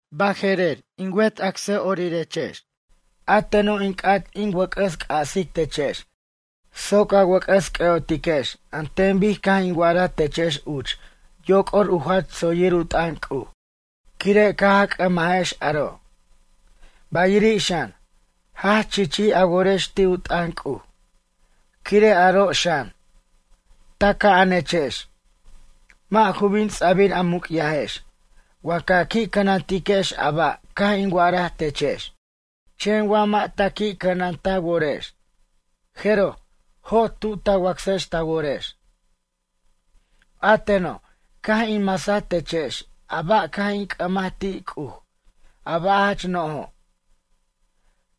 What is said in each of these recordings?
Baje'rer in wet acsa'orirex, a teno' in c'at in wʌc'ʌs c'asic techex soc a wʌc'ʌs c'ʌ'otiquex an ten bic caj in wa'araj techex uch yoc'or u jach tsoyir u t'ʌn C'uj. Quire' caj a c'ʌmajex aro', bayiri' xan, jach chichij a worex ti' u t'ʌn C'uj. Quire' aro' xan, taca'anechex. Mʌ' ju bin ts'abir a muc'yajex wa ca qui' cʌnantiquex a ba' caj in wa'araj techex. Chen wa mʌ' ta qui' cʌnan ta worex, jeroj jot tu ta wacsex ta worex. A teno', caj in masaj techex a ba' caj in c'ʌmaj ti' C'uj, a ba' jach nojo'.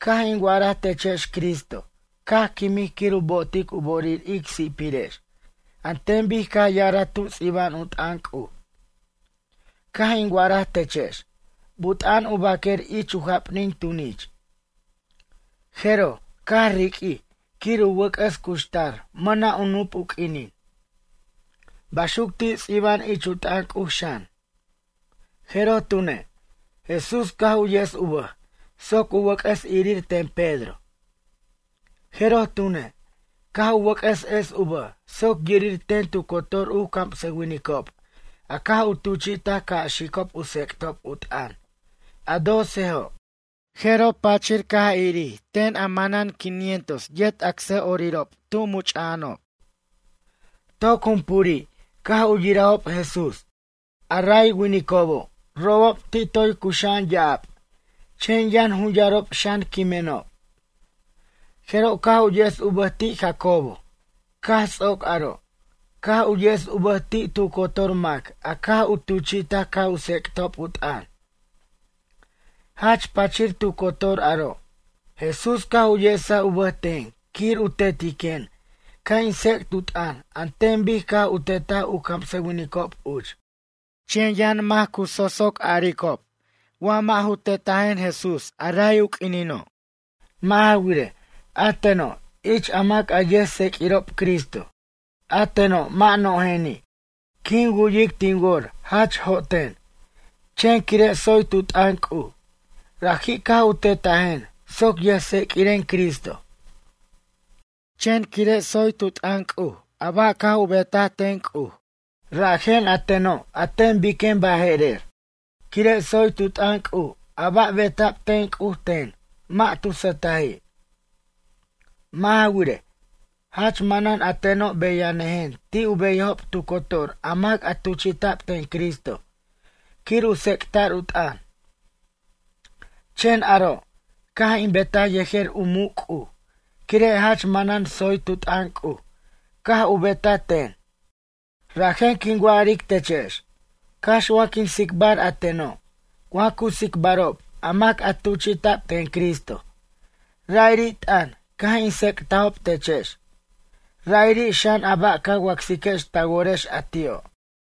Caj in wa'araj techex Cristo caj quimij quir u bo'otic u bo'orir ic si'pirex an ten bic caj ya'araj tu ts'iba'an u t'ʌn C'uj. Caj in wa'araj techex but'a'an u baquer ich u japnin tunich. Jeroj, caj riq'uij quir u wʌc'ʌs cuxtar mʌna' u nup u q'uinin. Baxuc ti' ts'iba'an ich u t'ʌn C'uj xan. Jeroj tune', Jesús caj u yes u bʌj soc u wʌc'ʌs irir ten Pedro. Jeroj tune', caj u wʌc'ʌs es u bʌj soc yirir ten tu cotor u camsʌwinicob a caj u tuchi'taj ca' xicob u tsec'tob u t'ʌn, a docejo'. Jeroj pachir caj irir ten a manan quinientos yet acsa'orirob tu much'a'anob. Toc jumpuri' caj u yirajob Jesús. A ray winicobo' robob, ti' toy cuxa'an ya'ab, chen yʌn jun yarob xan quimenob. Jeroj caj u yes u bʌj ti' Jacobo, caj ts'oc aro', caj u yes u bʌj ti' tu cotor mac a caj u tuchi'taj ca' u tsec'tob u t'ʌn. Jach pachir tu cotor aro', Jesús caj u yesaj u bʌj ten quir u tetiquen ca' in tsec't u t'ʌn an ten bic caj u tetaj u camsʌwinicob uch. Chen yʌn mac u so'soc aricob wa mʌ' ju tetajen Jesús a ray u q'uinino'. Mʌ' ja wirej, a teno' ich a mac a yʌjtseq'uirob Cristo, a teno' mʌ' nojeni'. Quin wu'yic tin wor jach joten, chen quire' tsoy tu t'ʌn C'uj, raji' caj u tetajen soc yʌjtseq'uiren Cristo. Chen quire' tsoy tu t'ʌn C'uj a ba' caj u betaj ten C'uj, rajen a teno' a ten biquen baje'rer. Quire' tsoy tu t'ʌn C'uj a ba' beta'b ten C'uj ten, mʌ' tu sʌtaji'. Mʌ' ja wirej, jach manan a teno' beyanʌjen ti' u beyajob tu cotor a mac a tuchi'ta'b ten Cristo quir u tsec'ta'r u t'ʌn. Chen aro' caj in betaj yejer u muc' C'uj, quire' jach maman tsoy tu t'ʌn C'uj caj u betaj ten. Rajen quin wa'aric techex, cax wa quin tsicbar a teno', wa cu tsicbarob a mac a tuchi'ta'b ten Cristo, ra'iri' t'ʌn caj in tsec'tajob techex, ra'iri' xan a ba' ca wacsiquex ta worex a ti'o'.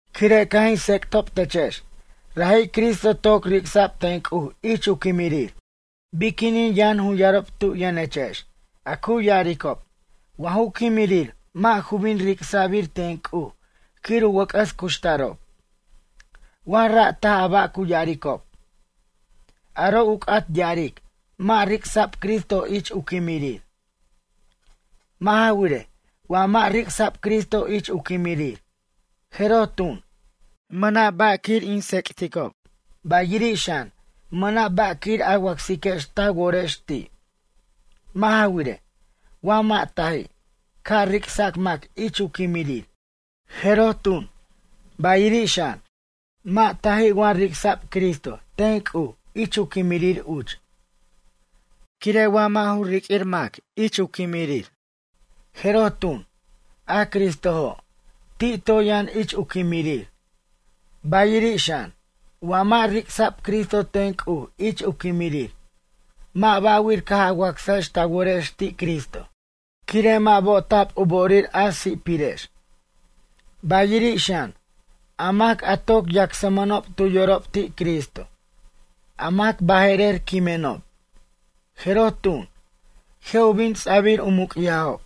Quire' caj in tsec'tob techex, raji' Cristo toc ric'sa'b ten C'uj ich u quimirir, biquinin yʌn jun yarob tu yʌnechex a cu ya'aricob wa ju quimirir mʌ' ju bin ric'sa'bir ten C'uj quir u wʌc'ʌs cuxtarob? Wa ra' taj a ba' cu ya'aricob, aro' u c'at ya'aric mʌ' ric'sa'b Cristo ich u quimirir. Mʌ' ja wirej, wa mʌ' ric'sa'b Cristo ich u quimirir, jeroj tun, mʌna' ba' quir in tsec'ticob, bayiri' xan, mʌna' ba' quir a wacsiquex ta worex ti'. Mʌ' ja wirej, wa mʌ' taji' ca' ric'sac mac ich u quimirir, jeroj tun, bayiri' xan, mʌ' taji' wa ric'sa'b Cristo ten C'uj ich u quimirir uch. Quire' wa mʌ' ju riq'uij mac ich u quimirir jeroj tun, a Cristojo', ti' toy yʌn ich u quimirir. Bayiri' xan, wa mʌ' ric'sa'b Cristo ten C'uj ich u quimirir mʌ' ba'wir caj a wacsajex ta worex ti' Cristo, quire' mʌ' bo'ta'b u bo'orir a si'pirex. Bayiri' xan, a mac a toc yacsmʌnob tu yorob ti' Cristo, a mac baje'rer quimenob, jeroj tun, je' u bin ts'abir u muc'yajob.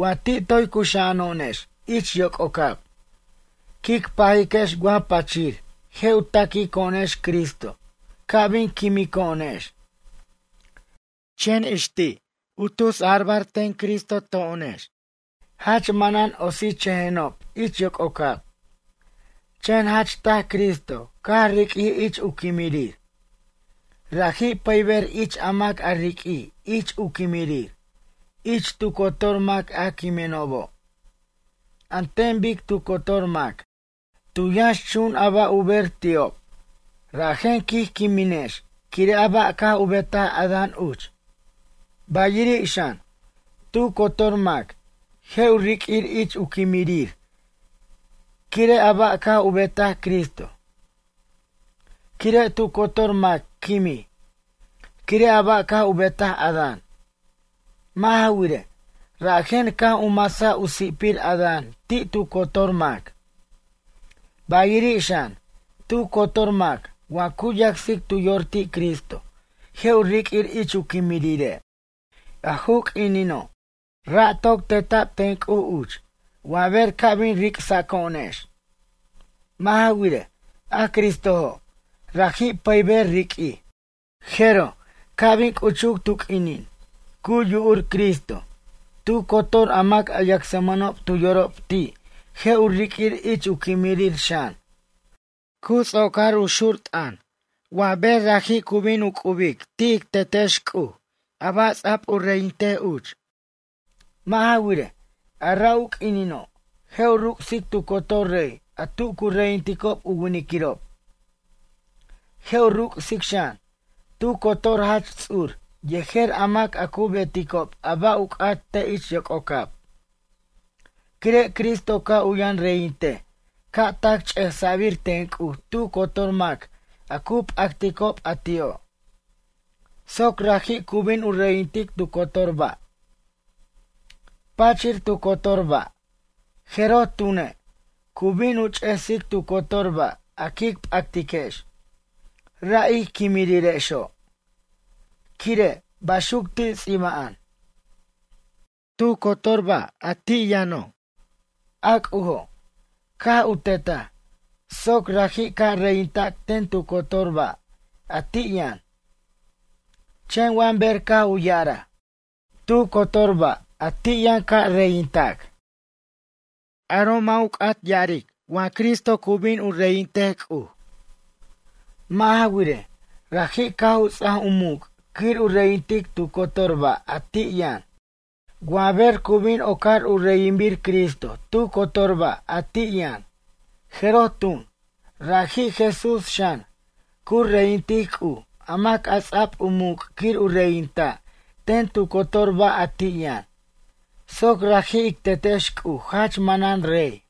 Wa ti' toy cuxa'ano'onex ich yoc'ocab, quic pajiquex wa pachir je' u taquico'onex Cristo ca' bin quimico'onex, chen ix ti' u tusabar ten Cristo to'onex. Ay quen, jach manan otsichʌjenob ich yococab. Chen jach taj Cristo caj riq'uij ich u quimirir. Raji' pʌyber ich a mac a riq'uij ich u quimirir, ich tu cotor mac a quimenobo'. An ten bic tu cotor mac, tu yʌnxchun a ba' u ber ti'ob, rajen quij quiminex quire' a ba' caj u betaj Adán uch. Bayiri' xan, tu cotor mac, je' u riq'uir ich u quimirir quire' a ba' caj u betaj Cristo. Quire' tu cotor mac quimij, quire a ba' caj u betaj Adán. Mʌ' ja wirej, rajen caj u masa u si'pir Adán ti' tu cotor mac. Bayiri' xan, tu cotor mac wa cu yacsic tu yor ti' Cristo je' u riq'uir ich u quimirire'. A ju q'uinino', ra' toc teta'b ten C'uj uch wa ber ca' bin ric'saco'onex. Mʌ' ja wirej, a Cristojo', raji' pʌyber riq'uij. Jeroj ca' bin c'uchuc tu q'uinin cu yu'ur Cristo, tu cotor a mac a yacsmʌnob tu yorob ti' je' u riq'uir ich u quimirir xan. Cu ts'ocar u xur t'ʌn, wa ber raji' cu bin u c'ubic ti' ic Tetex C'uj a ba' ts'a'b u reyintej uch. Mʌ' ja wirej, a ra' u quinino', je' u ruc'sic tu cotor rey a tu cu reyinticob u winiquirob. Je' u ruc'sic xan, tu cotor jach ts'ur yejer a mac a cu beticob a ba' u c'at te' ich yococab. Quire' Cristo ca' u yʌn reyintej ca' tac ch'ejsa'bir ten C'uj tu cotor mac a cu p'acticob a ti'o', soc raji' cu bin u reyintic tu cotor ba'. Pachir tu cotor ba', jeroj tune', cu bin u ch'ejsic tu cotor ba' a quic p'actiquex, ra' ic quimirirexo'. Quire', baxuc ti' ts'iba'an: “Tu cotor ba' a ti' yʌno', a C'ujo', caj u tetaj, soc raji' ca' reyintac ten tu cotor ba', a ti' yʌn.” Chen wa ber caj u ya'araj: “Tu cotor ba' a ti' yʌn ca' reyintac”, aro' mʌ' ju c'at ya'arej wa Cristo cu bin u reyintej C'uj. Mʌ' ja wirej, raji' caj u ts'aj u muc' quir u reyintic tu cotor ba' a ti' yʌn. Wa ber cu bin ocar u reyinbir Cristo tu cotor ba' a ti' yʌn, jeroj tun, raji' Jesús xan, cu reyintic C'uj a mac a ts'a'b u muc' quir u reyinta' ten tu cotor ba' a ti' yʌn, soc raji' ic Tetex C'uj jach manan rey.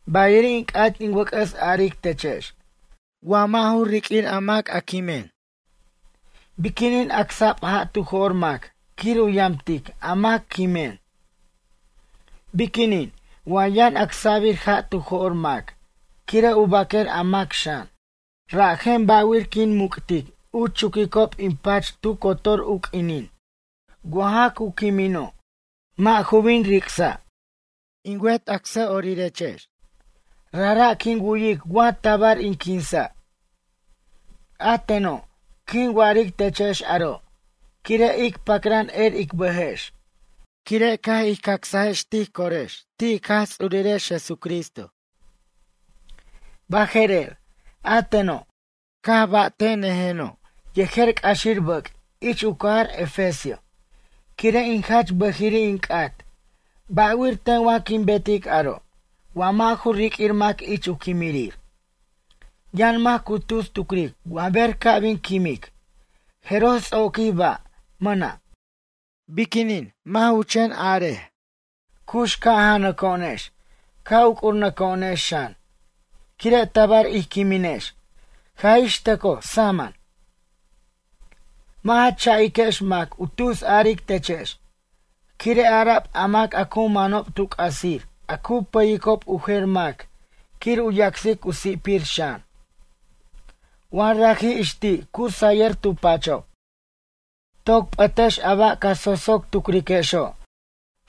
Bayiri' in c'at in wʌc'ʌs aric techex, wa mʌ' ju riq'uir a mac a quimin, biquinin acsa'b ja' tu jo'r mac quir u yamtic a mac quimen? Biquinin, wa yʌn acsa'bir ja' tu jo'r mac quire' u baquer a mac xan? Rajen ba'wir quin muc'tic u chuquicob in pach tu cotor u q'uinin wa ja cu quimino' mʌ' ju bin ric'sa'? In wet acsa'orirex, rajra' quin wu'yic wa tabar in quinsa'. A teno', quin wa'aric techex aro' quire' ic pacran er ic bʌjex, quire' caj ij cacsajex tij corex ti' ic Jaj Ts'urirex Jesucristo. Baje'rer, a teno', caj ba'te'nʌjeno' yejer c'axir bʌc' ich u cajar Efesio, quire' in jach bʌjiri' in c'at, ba'wir ten wa quin betic aro' wa mʌ' ju riq'uir mac ich u quimirir? Yʌn mac cu tus tucric wa ber ca' bin quimic, jeroj ts'oquij ba', mʌna'. Biquinin, mʌ' ju chen a'ar: “Cux ca' janaco'onex, ca' uc'urnʌco'onex xan, quire' tabar ij quiminex, jaj ix tʌcoj samʌn.” Mʌ' ja cha'iquex mac u tus aric techex, quire' ara'b a mac a cu manob tu c'asir a cu pʌyicob u jer mac quir u yacsic u si'pir xan, wa raji' ix ti' cu sayʌr tu pachob. Toc p'ʌtex a ba' ca so'so' tucriquexo'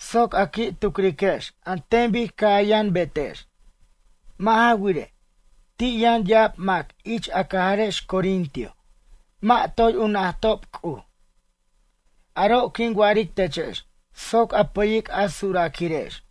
soc a qui' tucriquex an ten bic ca' a yʌn betex. Mʌ' ja wirej, ti' yʌn ya'ab mac ich a cajarex Corintio mʌ' toy u najtajob C'uj. Aro' quin wa'aric techex soc a pʌyic a surʌquirex.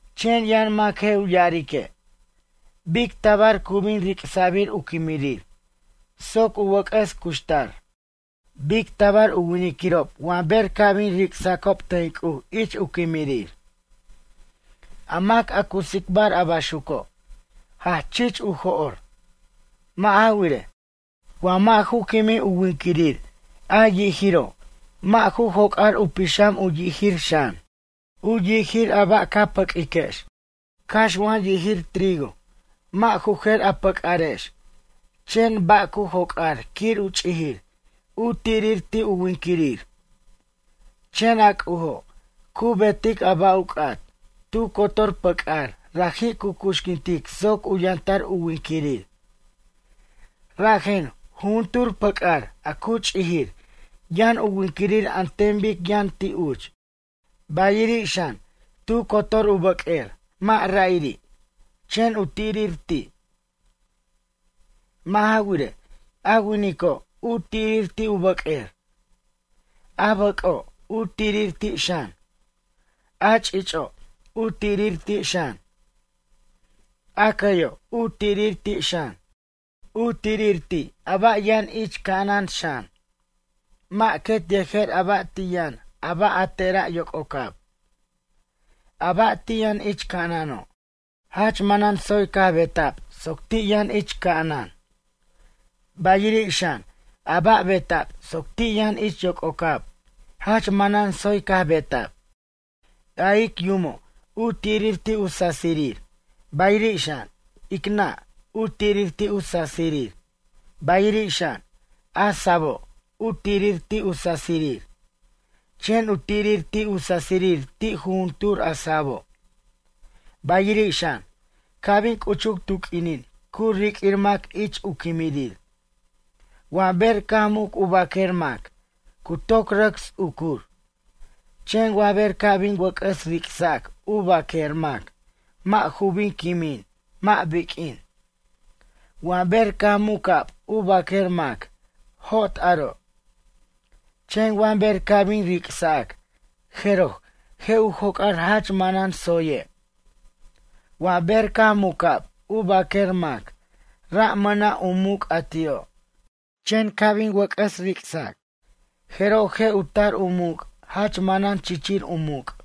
Chen yʌn mac je' u ya'arique': “Bic tabar cu bin ric'sa'bir u quimirir soc u wʌc'ʌs cuxtar? Bic tabar u winquirirob wa ber ca' bin ric'sacob ten C'uj ich u quimirir?” A mac a cu tsicbar a baxuco', jach chich u jo'r. Mʌ' ja wirej, wa mʌ' ju quimij u winquirir a yijiro', mʌ' ju joc'ar u pixam u yijir xan. U yijir a ba' ca pʌq'uiquex, cax wa yijir trigo wa ju jer a pʌc'arex, chen a ba' cu joc'ar quir u ch'ijir, u tirir ti' u winquirir. Chen a C'ujo', cu betic a ba' u c'at, tu cotor pʌc'ar raji' cu cuxquintic soc u yʌntar u winquirir. Rajen, jujuntur pʌc'ar a cu ch'ijir yʌn u winquirir an ten bic yʌn ti' uch. Bayiri' xan, tu cotor u bʌq'uer mʌ' ra'iri', chen u tirir ti'. Mʌ' ja wirej, a winico' u tirir ti' u bʌq'uer. A bʌc'o', u tirir ti' xan. A ch'ich'o' u tirir ti' xan. A cʌyo' u tirir ti' xan. U tirir ti' a ba' yʌn ich ca'anan xan. Mʌ' quet yejer a ba' ti' yʌn a ba' a tera' yoc'ocab. A ba' ti' yʌn ich ca'anano', jach manan tsoy caj beta'b soc ti' yʌn ich ca'anan. Bayiri' xan, a ba' beta'b soc ti' yʌn ich yoc'ocab, jach manan tsoy caj beta'b. A ic yumo', u tirir ti' u sasirir, bayiri' xan, ic nʌ', u tirir ti' u sasirir. Bayiri' xan, a sabo', u tirir ti' u sasirir, chen u tirir ti' u sasirir ti' jujuntur a sabo'. Bayiri' xan, ca' bin c'uchuc tu q'uinin cu riq'uir mac ich u quimirir. Wa ber caj muc u bʌq'uer mac, cu toc rʌc ts'ucur. Chen wa ber ca' bin wʌc'ʌs ric'sac u baq'uer mac mʌ' ju bin quimin mʌ' biq'uin. Wa ber caj muca'b u bʌq'uer mac, jot aro'. Chen wa ber ca' bin ric'sac, jeroj je' u joc'ar jach manan tsoye'. Wa ber caj muca'b u baq'uer mac, ra' mʌna' u muc' a ti'o', chen ca' bin wʌc'ʌs ric'sac, jeroj je' u tar u muc' jach manan chichir u muc'.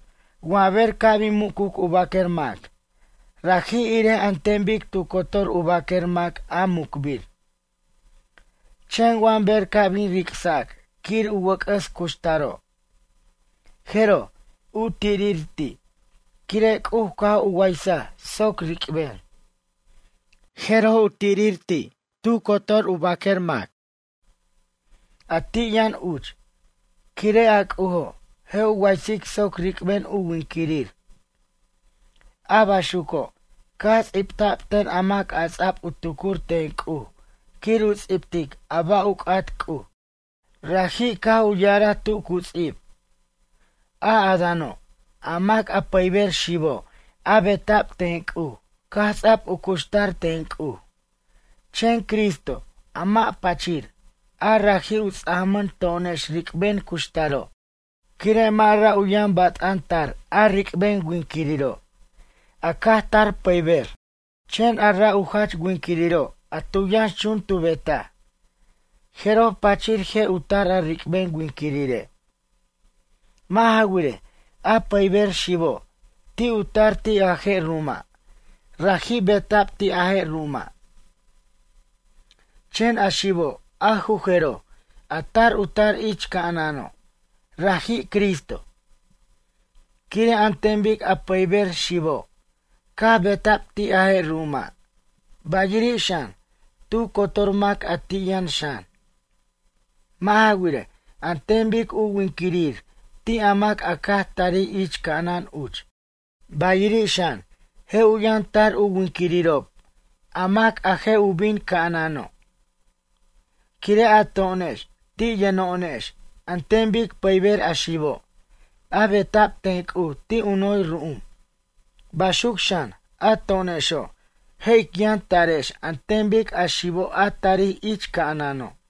Wa ber ca' bin mucuc u baq'uer mac, raji' irej an ten bic tu cotor u baq'uer mac a mucbir. Chen wa ber ca' bin ric'sac quir u wʌc'ʌs cuxtaro', jeroj, u tirir ti', quire' C'uj caj u waysaj soc ric'ben. Je' u tirir ti', tu cotor a bʌq'uer mac, a ti' yʌn uch, quire' a C'ujo', je' u waysic soc ric'ben u winquirir. A baxuco', caj ts'ibta'b ten a mac a ts'a'b u tucur ten C'uj quir u ts'ibtic a ba' u c'at C'uj. Raji' caj u ya'araj tu cu ts'ib: “A Adáno', a mac a pʌyber xibo', a beta'b ten C'uj caj ts'a'b u cuxtar ten C'uj.” Chen Cristo, a mac pachir, a raji' u ts'ajmʌn to'onex ric'ben cuxtaro'. Quire' mʌ' ra' u yʌn bat'an tar a ric'ben winquiriro', a caj tar pʌyber, chen a ra' u jach winquiriro' a tu yʌnx chun tu betaj, jeroj pachir je' u tar a ric'ben winquirire'. Mʌ' ja wirej, a pʌyber xibo', ti' u tar ti' a je' ru'uma', raji' beta'b ti' a je' ru'uma'. Chen a xibo' a ju jeroj, a tar u tar ich ca'anano', raji' Cristo. Quire' an ten bic a pʌyber xibo', caj beta'b ti' a je' ru'uma', bayiri' xan, tu cotor mac a ti' yʌn xan. Mʌ' ja wirej, an ten bic u winquirir ti' a mac a caj tarij ich ca'anan uch, bayiri' xan je' u yʌn tar u winquirirob a mac a je' u bin ca'anano'. Quire' a to'onex ti' yʌno'onex an ten bic pʌyber a xibo', a beta'b ten C'uj ti' u noy ru'um, baxuc xan, a to'onexo' je' ic yʌn tarex an ten bic a xibo' a tarij ich ca'anano'.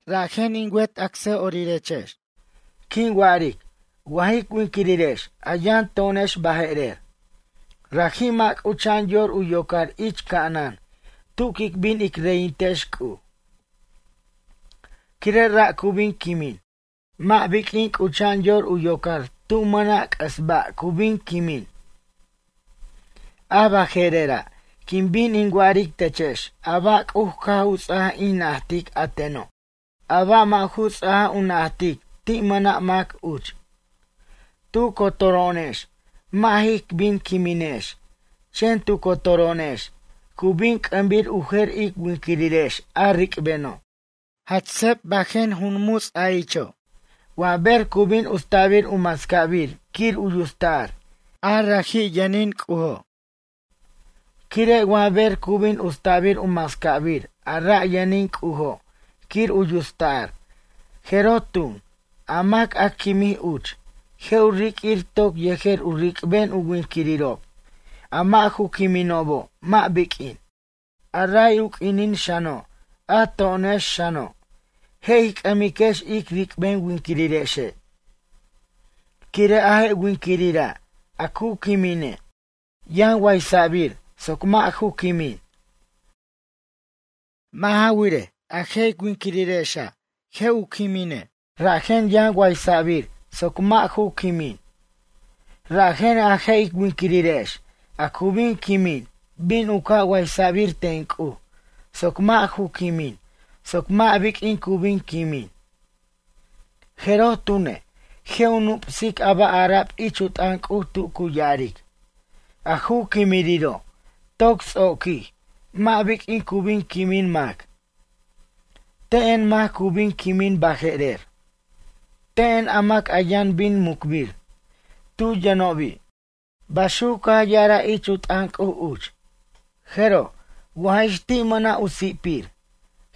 Rajen in wet acsa'orirex, quin wa'aric wa jic winquirirex a yʌn to'onex baje'rer, raji' mʌ' c'ucha'an yor u yocar ich ca'anan tu quic bin ic reyintex C'uj. Quire' ra' cu bin quimin, mʌ' biq'uin c'ucha'an yor u yocar tu mʌna' c'ʌs ba' cu bin quimin. A baje'rera', quin bin in wa'aric techex a ba' C'uj caj u ts'ajaj in najtic a teno', a ba' mʌ' ju ts'ajaj u najtic ti' mʌna' mac uch. Tu cotoro'onex mʌ' jic bin quiminex, chen tu cotoro'onex cu bin c'ʌmbir u jer ic winquirirex a ric'beno'. Jach seb bajen jun muts a icho', wa ber cu bin usta'bir u mascabir quir u yusta'r, a raji' yʌnin C'ujo'. Quire' wa ber cu bin usta'bir u mascabir a ra' yʌnin C'ujo' quir u yusta'r, jeroj tun, a mac a quimij uch, je' u riq'uir toc yejer u ric'ben u winquirirob, a mʌ' ju quiminobo' mʌ' biq'uin. A ray u q'uinin xano', a to'onex xano', je' ij c'ʌmiquex ic ric'ben winquirirexe'. Quire' a je' winquirira' a cu quimine', yʌn waysa'bir soc mʌ' ju quimin. Mʌ' ja wirej, a je' ic winquirirexe' je' u quimine', rajen yʌn waysa'bir soc mʌ' ju quimin. Rajen, a je' ic winquirirex a cu bin quimin bin u ca' waysa'bir ten C'uj, soc mʌ' ju quimin, soc mʌ' biq'uin cu bin quimin. Jeroj tune', je' u nup'sic a ba' ara'b ich u t'ʌn C'uj tu cu ya'aric: “A ju quimiriro' toc ts'oquij, mʌ' biq'uin cu bin quimin mac. Te'en mac cu bin quimin baje'rer? Te'en a mac yʌn bin mucbir, tu yʌnobi'?” Baxuc caj ya'araj ich u t'ʌn C'uj uch. Jeroj, wa jix ti' mʌna' u si'pir,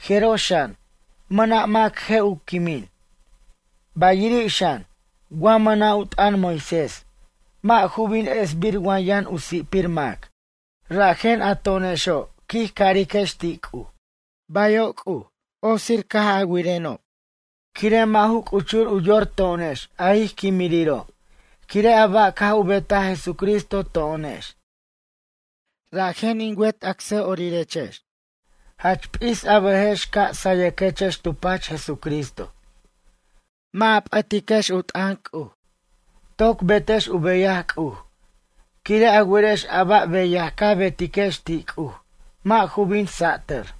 jeroj xan, mʌna' mac je' u quimin. Bayiri' xan, wa mʌna' u t'ʌn Moisés, mʌ' ju bin esbir wa yʌn u si'pir mac. Rajen a to'onexo', quij cariquex ti' C'uj: “Bayo' C'uj caj otsir a wirenob.” Quire' mʌ' ju c'uchur u yor to'onex a ij quimiriro' quire' a ba' caj u betaj Jesucristo to'onex. Rajen in wet acsa'orirex, jach p'is a bʌjex ca' sayʌquex tu pach Jesucristo. Mʌ' ja p'ʌtex u t'ʌn C'uj. Toc betex u beyaj C'uj, quire' a werex a ba' beyaj ca betiquex ti' C'uj mʌ' ju bin satʌr.